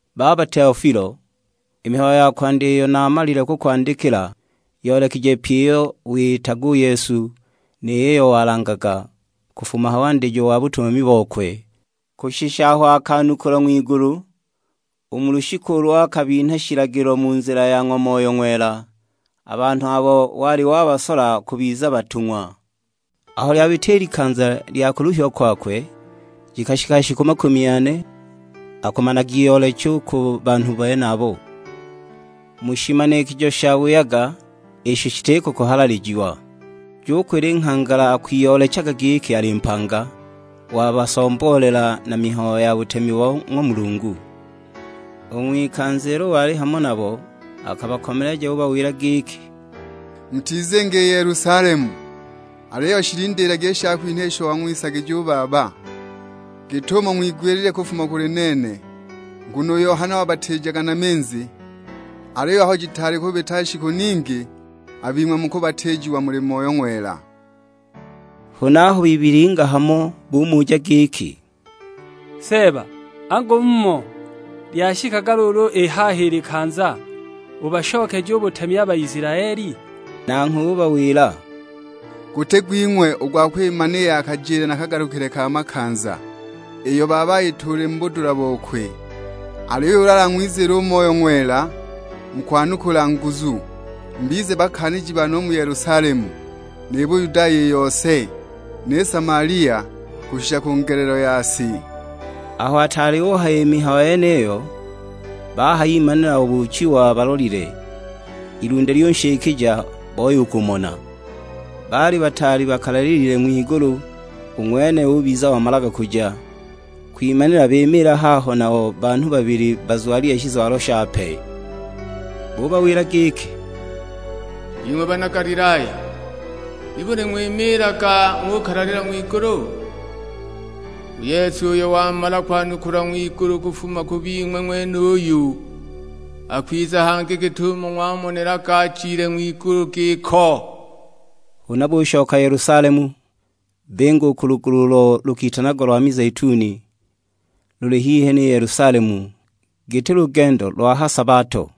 Baba Teofilo, i mihayo ya kwandya iyo naamalile kukwandikila, yoolekije pyi iyo wiyitaga u Yesu, ni yiyo walangaga, kufuma ha wandijo wa butumami bokwe, kushisha aho akanukulwa ng'wigulu; u mu lushiku ulo akabinha shilagilo mu nzila ya ng'wa Moyo Ng'wela, a banhu abo wali wabasola kubiza batung'wa. Aho lyabita i likanza lya kuluhiwa kwakwe, jikashika shiku makumi ane akumanagiyoolecha u ku banhu benabo, mu shimanikijo shabuyaga, isho shitiko kuhalalijiwa. Jukwila i nghangala akwiyoolechaga giki ali mpanga, wabasomboolela na mihayo ya butemi bo ng'wa Mulungu. U ng'wikanza ilo wali hamo nabo, akabakomeleja ubawila giki, "Mutizinga i Yelusalemu; aliyo shilindiilagi i shakwinha isho wang'wisagija u Baba, git'umo ng'wigwilile kufuma kuli nene. Nguno u Yohana wabatiijaga na minzi, aliyo aho jitaali kubita shiku ningi, a bing'we mukubatiijiwa muli Moyo Ng'wela." Huna aho bibilinga hamo bumuja giki; "Seeba, angu mmho lyashikaga luulu i haha i likanza, ubashokeje u butemi a Baisilaeli?" Nanghwe ubawila, "Guti gwing'we u gwa kwimana i ya kajile na kagalukile ka makanza, iyo Baba ayituulile mu budula bokwe. Aliyo ulu alang'wiziile u Moyo Ng'wela mukwanukula nguzu; mubize bakaaniji bane u mu Yelusalemu, ni Buyudaya i yose, ni Samalia; kushika ku ngelelo ya si." Aho ataali uhaya i mihayo yeniyo, bahayimanila obuuchiwa balolile; ilunde lyunshikija, boya u kumona. Baali bataali bakalalilile ng'wigulu, u ng'wene ubiza omalaga kuja, kwimanila bimiila haho nabo banhu babili bazwalile shizwalo shape. Bubawila giki, "''Bing'we bana Galilaya, nibuli ng'wimiilaga ng'ukalalila ng'wigulu? U Yesu uyo wamala kwanukulwa ng'wigulu kufuma ku bing'we ng'wenuyu, akwiza hangi git'umo ng'wamonelaga ajile ng'wigulu giko." Huna bushoka Yelusalemu, binga u ku lugulu ulo lukitanagwa lo mizeituni; luli hihi ni Yelusalemu, giti lugendo lwa ha sabato.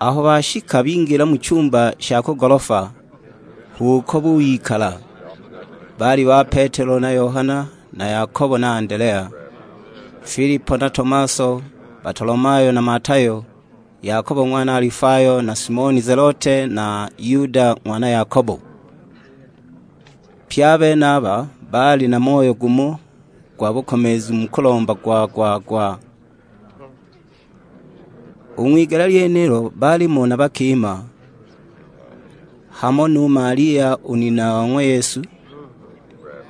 Aho bashika bingila mu chumba sha ku golofa; h'uko buyikala: baali ba Petelo na Yohana na Yakobo na Andelea, Filipo na Tomaso, Batolomayo na Matayo, Yakobo ng'wana Alifayo na Simoni Zelote na Yuda ng'wana Yakobo. Pye a benaba baali na moyo gumo gwa bukomeezu mu kulomba gwa-gwa-gwa. U ng'wigele lyenilo baalimo na bakima; hamo nu Malia u nina wa ng'wa Yesu,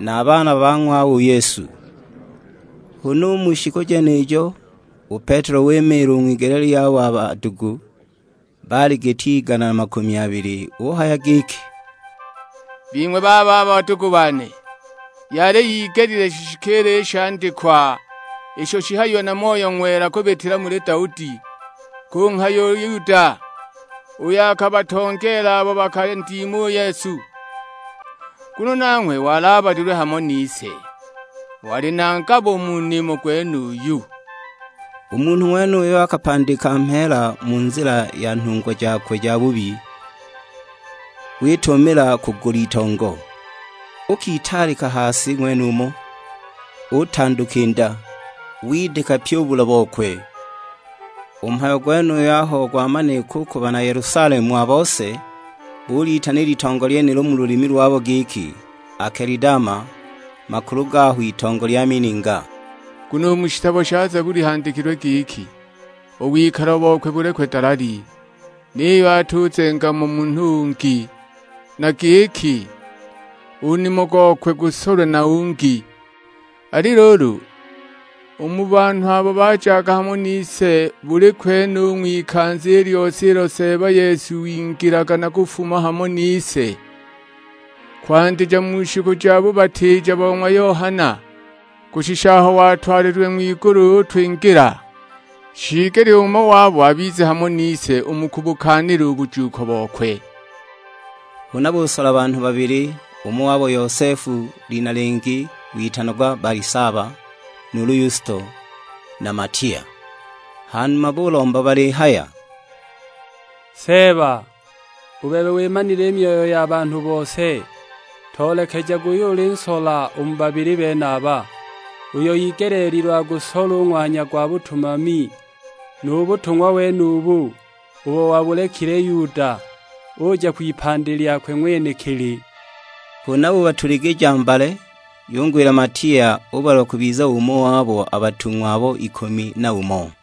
na a baana ba ng'wawe u Yesu. Huna u mu shiku jenijo, u Petelo wimiila u ng'wigele lyabo a badugu, (baali giti igana na makumi abili); uhaya giki, "Bing'we bababa badugu bane, yali igelile shishikiile i shandikwa isho shihayiwe na Moyo Ng'wela kubitila muli Daudi, kunghaya u Yuda, uyo akabatongeela abo bakandima u Yesu. Nguno nanghwe wali abalilwe hamo nise, wali na ngabo u mu nimo gwenuyu." (U munhu ng'wenuyo akapandika mheela mu nzila ya nhungwa jakwe jabubi, witumamila kugula itongo; uukitaalika ha si ng'wenumo, utanduka i nda, widika pyi u bula bokwe! U mhayo gwenuyu aho gwamanika u ku bana Yelusalemu a bose, bulitana i litongo lyenilo mu lulimi lwabo giki Akelidama, makulu gaho itongo lya mininga.) "Nguno u mu shitabo sha Zabuli handikilwe giki, 'U wikalo bokwe bulekwe dalali, niyo atizuzenga mo munhu ungi;' na giki, 'U nimo gokwe gusolwe na ungi.' "Ali luulu, u mu banhu abo bajaga hamo nise buli kwene u ng'wikanza i lyose ilo Seeba Yesu wingilaga na kufuma hamo nise; kwandija mu shiku ja bubatiija bo ng'wa Yohana, kushisha aho watwalililwe ng'wigulu utwingila, shiigelile umo wabo abize hamo nise u mu kubukaanila u bujuuko bokwe." Huna busola banhu babili, umo wabo Yosefu, lina lingi witanagwa Balisaba, nuulu Yusto; na Matiya. Hanuma bulomba balihaya, "Seeba, u bebe wimanile i myoyo ya banhu bose, toolekejage uyo ulinsola u mu babili benaba; uyo igeleelilwe agusole u ng'wanya gwa butumami nu butung'wa wenubu, ubo wabulekile Yuda, uja kwipandi lyakwe ng'wenekili." Huna bubatuligija mbale, yungwila Matiya, ubalwa kubiza umo wabo a batung'wa abo ikumi na umo.